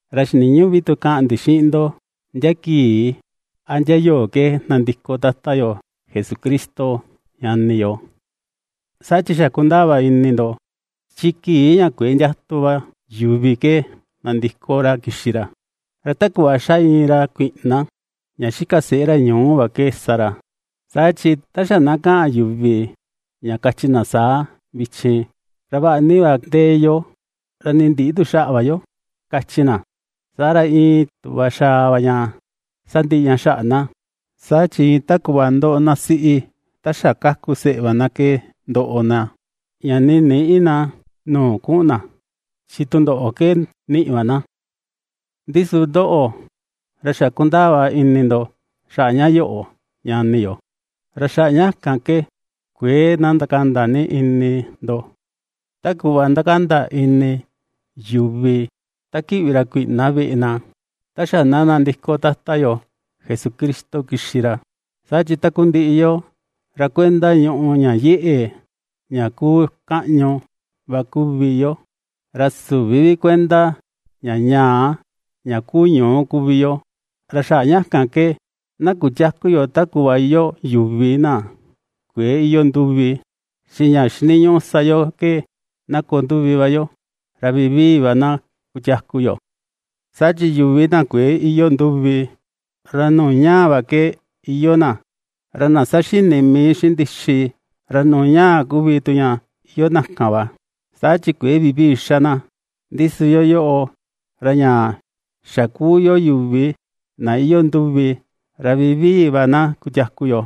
Ra xiniñüꞌu vi tu kaꞌan ndi xiꞌin ndo ndia kii a ndia yoo ke nandiko Tata yo Jesucristo, ñani yo. Saa chi xa kundaa va ini ndo, chi kii ña kuëe ndiatu va yuvi ke nandiko ra kixi ra, ra ta kuꞌva xa iin ra kuiꞌna ña xika seꞌé ra ñuu va ke sa ra. Saa chi ta xa na kaꞌan yuvi ña kachi na saa: “Vichin, ra vaꞌa ni va ndee yo, ra nii ndïꞌi tu xaꞌa va yo”, kachi na. Saa ra iin tuꞌva xaa va ña sandiꞌi xaꞌa na, saa chi iin ta kuꞌva ndoꞌo na siꞌi ta xa kaku seꞌe va na ke ndoꞌo na; ña nii nïꞌi na nuu kuꞌun na chi tundoꞌo ke niꞌi va na. Ndi su ndóꞌo̱, ra xa kundaa va ini ndo xaꞌa ña yoꞌo ñani yo, ra xaꞌa ña kan ke kuëe na ndakanda vi ini ndo, ta kuꞌva ^ndakanda ini yuvi ta kiꞌvi ra kuiꞌna veꞌe na, ta xa na nandiko Tata yo Jesucristo kixi ra. Saa chi takundiꞌi yoo, ra kuenda ñùꞌù ña yeꞌe, ña kuu kaꞌñu va kuvi yo. Ra süvi vi kuenda ña ñaa, ña kuu ñuú kuvi yo; ra xaꞌa ña kan ke na kutiäku yo ta kuꞌva iyoo yuvi na kuëe iyoo nduvi, chi ña xiniñuꞌu sa yo ke na koo nduvi va yo, ra vivii va na kutiaku yo. Saa chi yuvi na kuëe iyoo nduvi, ra nuu ñaa va ke iyoo na, ra na ^saxini mii xiꞌin ndixi, ra nuu ñaa kuvi tu ña iyoo tu na kan va, saa chi kuëe vivii xa na; ndi su yoo, ra ña xa kuu yo yuvi na iyoo nduvi, ra vivii va na kutiaku yo,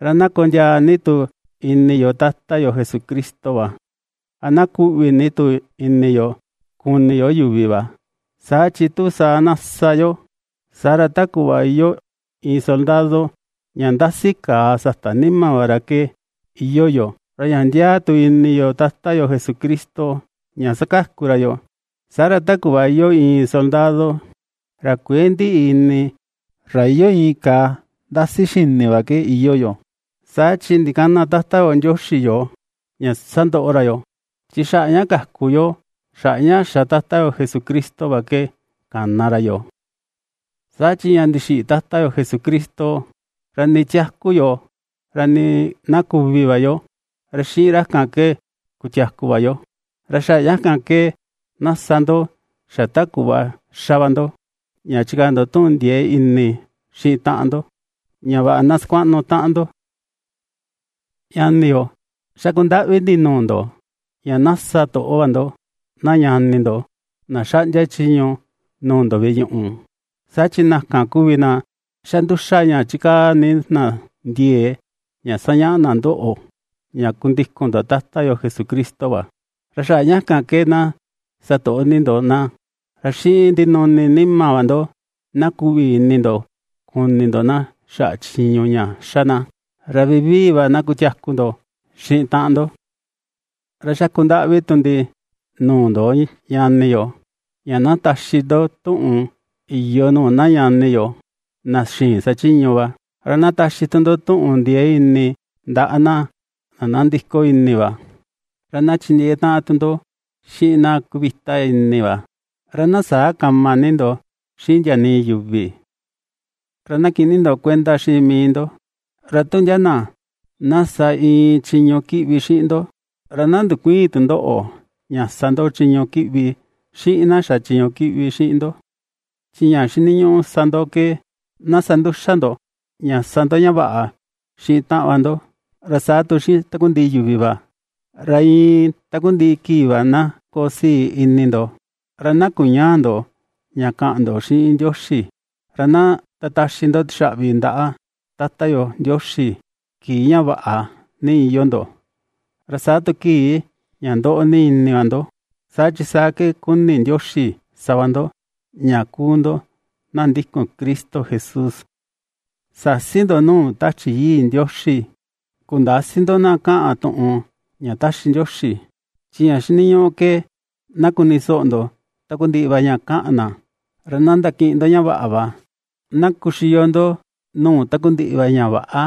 ra na kondiaa ni tu ini yo Tata yo Jesucristo va, ra na kuꞌvi ni tu ini yo kuni yo yuvi va, saa chi tu saa na sa yo, saa ra ta kuꞌva iyoo iin soldado ña ndasi kàà sata nima va ra ke iyoo yo. Ra ña ndiaa tu ini yo Tata yo Jesucristo ña ^sakaku ra yoo, saa ra, ta kuꞌva iyoo iin soldado ra kuëe ndiꞌi ini, ra iyoo iin kàà ndasi xini va ke iyoo yo. Saa chi ndikäna Tata yo Ndioxi yoo, ña sandoꞌo ra yoo, chi xaꞌa ña kaku yo xaꞌa ña xa Tata yo Jesucristo va ke kana ra yoo. Saa chi ña ndixiꞌi Tata yo Jesucristo, ra nii tiaku yo, ra nii na kuvi va yo, ra xiꞌin ra ke kutiaku va yo. Ra xaꞌa ña kan ke na sa ndo xa ta kuꞌva ^xa va ndo, ña chikaa ndo tuꞌun ndiee ini xiꞌin taꞌan ndo, ña vaꞌa na sakuaꞌnu taꞌan ndo. Ñani yo, ^xaku ndaꞌvi ndi nuu ndo ña na sa toꞌo va ndo na ñani ndo na xaꞌndia chiñu nuu ndo veꞌe ñuꞌu, saa chi na kan kuvi na ^xa nduxa ña chikaa ni na ndiee ña sañaꞌa na ndoꞌo ña kundikun ndo Tata yo Jesucristo va. Ra xaꞌa ña kan ke na satoꞌo ni ndo na, ra xiꞌin ndinuni nima va ndo na kuꞌvi ini ndo kuni ndo na xaꞌa chiñu ña ^xa na. Ra vivii va na kutiaku ndo xiꞌin taꞌan ndo. Ra xaku ndaꞌvi tu ndi nuu ndo, ñani yo, ña na taxi ndo tuꞌun iyo nuu na ñani yo na xïin sachiñu va, ra na taxi tu ndo tuꞌun ndiee ini ndaꞌa na nandiko ini va, ra na chindiee taꞌan tu ndo xiꞌin na kuvita ini va, ra na säa kama ni ndo xiꞌin ndia nii yuvi. Ra na kiꞌin ni ndo kuenda xiꞌin mii ndo, ra tu ndia na na sa iin chiñu kiꞌvi xiꞌin ndo, ra na ndukuïin tu ndoꞌo ña sa ndo chiñu kiꞌvi xiꞌin na xa chiñu kiꞌvi xiꞌin ndo. Chi ña xiniñuꞌu sa ndo ke na sa nduxa ndo ña sa ndo ña vaꞌa xiꞌin taꞌan va ndo, ra saa tu xiꞌin takundiꞌi yuvi va. Ra iin takundiꞌi kii va na koo sii ini ndo. Ra na kuñäa ndo ña kaꞌan ndo xiꞌin Ndioxi. Ra na ndataxi ndo tixaꞌvi ndaꞌa Tata yo Ndioxi kii ña vaꞌa ni iyoo ndo, ra saa tu kii ña ndoꞌo ni ini va ndo, saa chi saa ke ^kuni Ndioxi sa va ndo ña kuu ndo na ndikun Cristo Jesús. Säsi ndo nuu Tachi Yii Ndioxi. Kundäsi ndo na kaꞌan tuꞌun ña taxi Ndioxi. Chi ña xiniñuꞌu ke na kuni soꞌo ndo takundiꞌi va ña kaꞌan na. Ra na ndakiꞌin ndo ña vaꞌa va. Na kuxiyo ndo nuu takundiꞌi va ña väꞌa.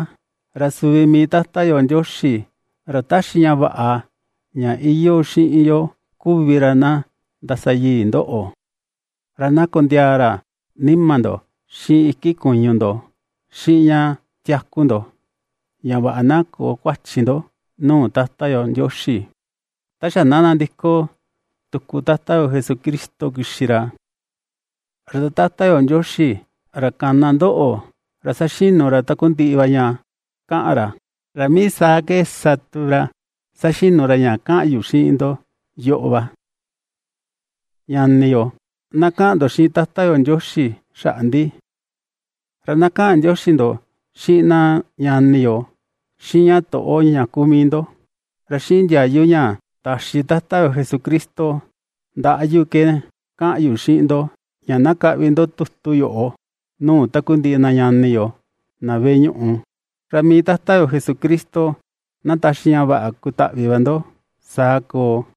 Ra suvi mii Tata yo Ndioxi ra ^taxi ña vaꞌa ña iyoo xiꞌin yo kuvi ra ná ndasayii ndoꞌo, ra na kondiaa ra nima ndo, xiꞌin iki kuñu ndo, xiꞌin ña tiaku ndo ña vaꞌa na köo kuachi ndo nuu Tata yo Ndioxi, ta xa na nandiko tuku Tata yo Jesucristo kixi ra. Ra Tata yo Ndioxi, ra kana ndoꞌo, ra ^saxinu ra takundiꞌi va ña kaꞌan ra, ra mii saa ke sa tu ra ña saxinu ra ña kaꞌan yu xiꞌin ndo yoꞌo va. Ñani yo, na kaꞌan ndo xiꞌin Tata yo Ndioxi xaꞌa ndi. Ra na kaꞌan ndioxi ndo xiꞌin na ñani yo xiꞌin ña toꞌo ña kuu mii ndo. Ra xiꞌin ndiayu ña taxi Tata yo Jesucristo ndaꞌa yu ke kaꞌan yu xiꞌin ndo ña na kaꞌvi ndo tutu yoꞌo nuu takundiꞌi na ñani yo na veꞌe ñuꞌu. Ra mii Tata yo Jesucristo na taxi ña vaꞌa kutaꞌvi va ndo. Saa koo.